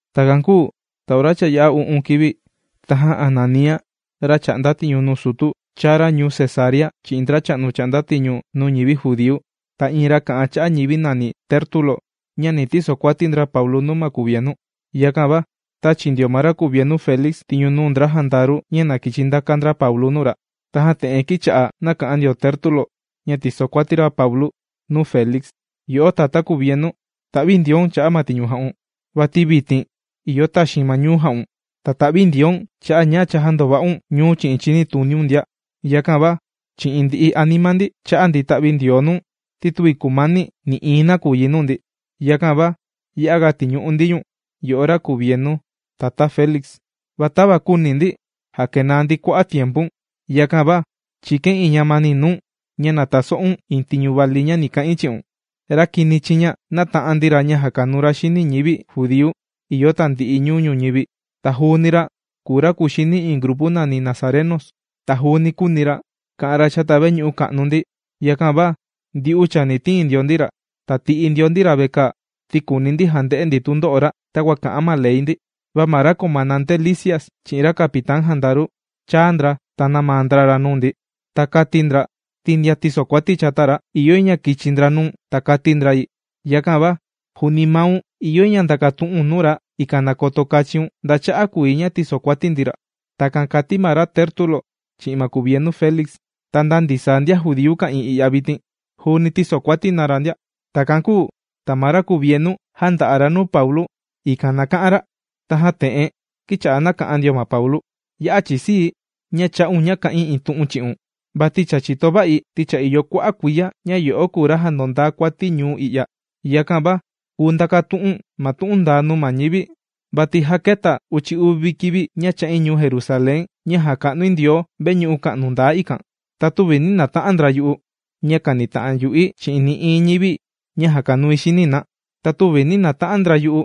Takan kūu ta ora cha yā'a u'un kivi tajan Ananía ra chà'nda tiñu nuu sutu, chāa ra ñuu Cesarea chi'in ndracha'nu chà'nda tiñu nuu ñivi judíu, ta iin ra kà'an cha'a ñivi nàni Tértulo ña ni tisokuati ndra Paulu nuu ma kuvienu. Yakan va tāchi ndio ma ra kuvienu Félix tiñu nuu ndra jandaru ña na kichi ndakan ndra Paulu nuu ra. Tajan te'en kīcha'a nàka'an ndio Tértulo ña tìsokuati ra Paulu nuu Félix: ―Yo'o tatá kuvienu, ta'vindioun cha'a' ma tiñu jà'un. Vati vitin ìyo taxiin ma ñuu jà'un. Ta ta'vindioun ña cha jāndova'un ñuu chi'in chinituniun ndia. Yakan va chi'in ndi'i anima ndi, chā'a ndi ta'vindioo nuu̱n, ti tüvi kumani nï'iin nakuyi nuu ndi. Yakan va ya'aga tìñu'u ndi ñu̱n, yo'o ra kuvienu, tatá Félix. Va tava küuni ndi jakenaa ndi kua'a' tiempu̱n, yakan va chìkain iin ñamani nuu̱n, ña na taso'un iin tiñu vali ña ni ka'in chi'un. Ra kini chiña nāta'an ndi ra ña jàkanuu ra xini ñivi judíu ìyo tandi'i ñuu ñuñivi. Ta juuni ra kùu ra kuxini iin grupu nàni nazarenos. Ta juuni kūuni ra ka'an ra chata veñu'u ka'nu ndi. Yakan va ndyu'u chani tiin ndio ndi ra, ta ti'i ndio ndi ra vekaa, ti kùuni ndi jande'e ndi tundo'o ra takua kà'an ma ley ndi. Va ma ra comandante Lisias chi'in ra capitán jandaru, chāa ndra ta nāmaa ndra ra nuu ndi. Ta kāti ndra ti ndian tīsokuati chata ra, ìyo yi ña kichi ndra nuu̱n ta kati ndra yi. Yakan va juuni maun ìyo yi ña ndakatu'un nuu ra, ikan na koto kachiun nda cha'a' kùu yi ña tìsokuati ndi ra. ―Takan kàti ma ra Tértulo chi'in ma kuvienu Félix. Ta nda ndisaa ndian judíu ka'ìin i'ya vitin, juuni tīsokuati na ra ndia. Takan kūu ta ma ra kuvienu jānda'a ra nuu Paulu, ikan na ka'an ra. Tajan te'en kīcha'a nàka'an ndio ma Paulu: ―Ya'a chìsii̱ ña chā'un ña kà'in iin tu'un chi'un. Vati cha chìto va'i ti cha ìyo kua'a' kuiya ña yo'o kùu ra jàndondaa kuati ñuu i'ya. Yakan va kùu ndakatu'u̱n ma tu'un ndaa nuu ma ñivi, vati já kēta uchi uvi kivi ña chā'in ñuu Jerusalén ña jàka'nui Ndioo veñu'u ka'nu ndaa ikan. Ta tüvi nī nata'an ndra yu'u, ña kànita'an yu'i chi'in nï'iin ñivi ña jàkanui xini na. Ta tüvi nī nata'an ndra yu'u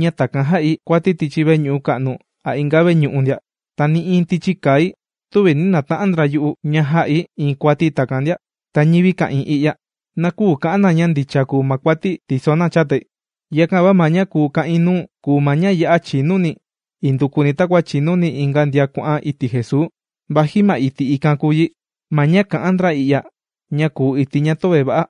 ña takan jā'i kuati tichi veñu'u ka'nu a inga veñu'u ndia. Ta nï'iin tichi kai tüvi nī nata'an ndra yu'u ña jā'i iin kuati takan ndia. Ta ñivi ka'ìin i'ya, na küu ka'an na ña ndicha kùu ma kuati̱ tìso ndo chatai. Yakan va ma ña kùu ka'in nuu̱n, kùu ma ña ya'a chinuni̱ indukuni takua chìnuni inga ndian kuà'an iti' Jesuu, vaji ma iti' ikan kùu yi ma ña kà'an ndra i'ya ña kùu iti' ña töve va'a.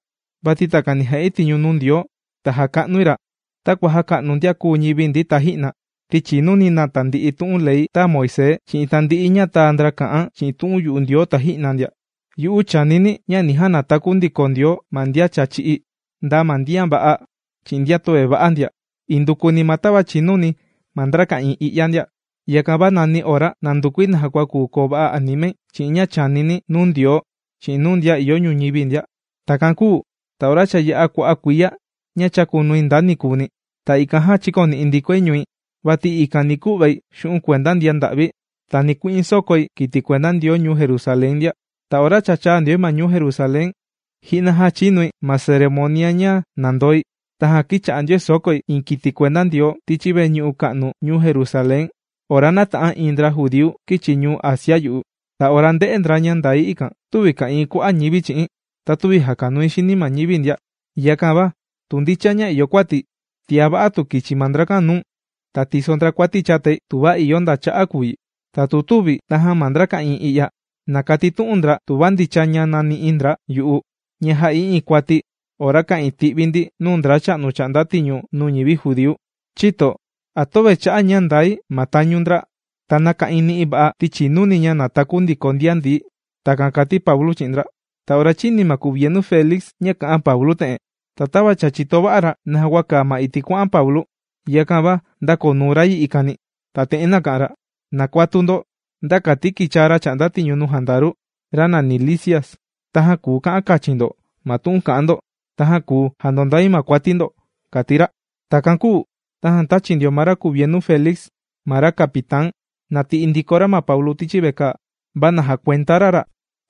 Vati takani jà'i tiñu nuu Ndioo ta jàka'nui ra takua jāka'nu ndian kūu ñivi ndi taji'na, ti chìnuni̱ tandi'i tu'un ley tāa Moisés chi'in tandi'i ña tāa ndra kà'an chi'in tu'un yu'u Ndioo taji'na ndia. Yu'u chìnuni̱ ña ni janataku Ndioo ma ndian cha chī'í, nda ma ndian va'a chi'in ndian töve va'a ndia, indukuni ma tava chìnuni ma ndra ka'ìin i'ya ndia. Yakan va nani ora nàndukui naja kua kuu koo va'a animai chi'in ña chànini̱ nuu Ndioo chi'in nuu ndian ìyo ñuñivi ndia. ’Takan kūu ta ora cha yā'a kua'a' kuiya ña chàkunui nda ni nikuuni. Ta ikan jan chīkoni'i ndikoi ñui, vati ikan ni ku'vai xu'un' kuenda ndian nda'vi, ta ni ku'in sokói kiti kuenda Ndioo ñuu Jerusalén ndian. Ta ora cha chāa ndioi ma ñuu Jerusalén, ji'na jāchinui ma ceremonia ña nàndoi. Tajan kīcha'a ndioi sòkói iin kiti kuenda Ndioo tichi veñu'u ka'nu ñuu Jerusalén ora nāta'an iin ndra judíu kīchi ñuu Asia yu'u. Ta ora ndē'e ndra ña ndai ikan, tüvi ka'ìin kua'a' ñivi chi'i̱n, ta tüvi jàkanui xini ma ñivi ndia. Yakan va tu ndicha ña ìyo kuati̱, tiá va'a tu kichi ma ndrakan nuu̱n, ta tiso ndra kuati chatai, tuva ìyo nda cha'a' kùu yi. Ta tu tüvi, tajan ma ndra ka'ìin i'ya, na katitu'un ndra tuva ndicha ña nāni'i ndra yu'u, ña jā'i iin kuati ora ka'ìin ti'vi ndi nuu ndracha'nu chà'nda tiñu nuu ñivi judíu. Chïto, ¿a töve cha'a' ña ndai ma tañu ndra ta nāka'in ni'i va'a ti chìnuni̱ ña ni nataku ndiko ndian ndií kùu yi? ―Takan kāti Paulu chi'in ndra. Ta ora chīni ma kuvienu Félix ña kà'an Paulu te'en, ta tava cha chìto va'a ra naja kua kàa ma iti' kuà'an Paulu, yakan va ndākoo nuu ra yi ikani, ta te'en nāka'an ra: ―Na kuatu ndo nda kati kichaa ra chà'nda tiñu nuu jandaru, ra nàni Lisias. Tajan kùu ka'an kachin ndo ma tu'un ka'an ndo, tajan kùu jandondai ma kuati ndo ―kàti ra. Takan kūu tajan tāchi ndio ma ra kuvienu Félix ma ra capitán, na ti'i ndiko ra Paulu tichi vekaa. Ta na jakuenda ra ra,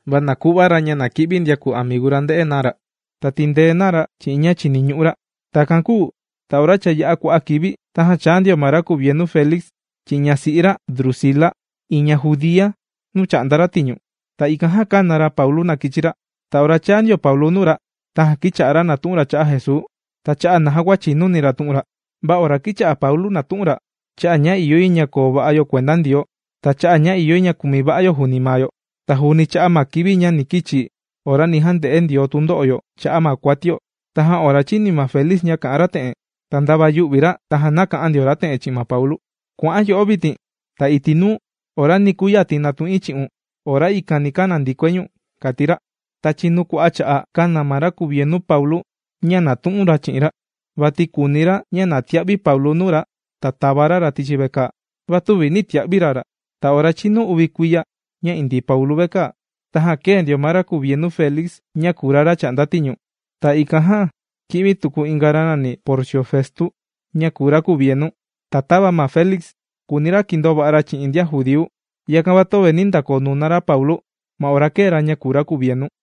va na ku'va ra ña kì'vi ndian kùu amigu ra nde'e na ra, ta tindee na ra chi'in ña chìniñu'u ra. Takan kūu ta ora cha yā'a kua'a' kivi, tajan chāa ma ra kuvienu Félix chi'in ñasi'i ra Drusila iin ña judía nuu chà'nda ra tiñu. Ta ikan jan kāna ra Paulu na kichi ra. Ta ora chāa ndio Paulu nuu ra, tajan kìcha'a ra nàtu'un ra cha'a' Jesuu ta cha'a' ña naja kua chìnuni ra tu'un ra. Va ora kīcha'a Paulu nàtu'un ra cha'a' ña ìyo yi ña koo va'a yo kuenda Ndioo, ta cha'a' ña ìyo yi ña kumi yo juuni maa yo, ta juuni cha'a' ma kivi ni kichi ora ni jande'e Ndioo tundo'o yo cha'a' ma kuatio. Tajan ora chīni ma Félix ña kà'an ra te'en, ta ndava yū'vi ra, tajan nāka'an ndio ra te'en chi'in ma Paulu. ―¡Kua'an yo'o vitin! Ta iti' nuu, ora ni kuyati natu'in chi'un ora ikan ni kana ndikoi ñu̱n ―kàti ra. Ta chinu kua'a' cha'a', kāna ma ra kuvienu Paulu ña nàtu'un ra chi'in ra, vati kùuni ra ña na tia'vi Paulu nuu ra ta tava ra ra tichi vekaa. Va tüvi nī tia'vi ra ra. Ta ora chīnu uvi kuiya ña indii Paulu vekaa, tajan kēe ndio ma ra kuvienu Félix ña kùu ra ra chà'nda tiñu. Ta ikan jan kī'vi tuku inga ra nàni Porcio Festo, ña kùu ra kuvienu. Ta tava Félix kùuni ra kindoo va'a ra chi'in ndian judíu, yakan va töve nī ndakoo nuna ra Paulu ma ora kēe ra ña kùu ra kuvienu.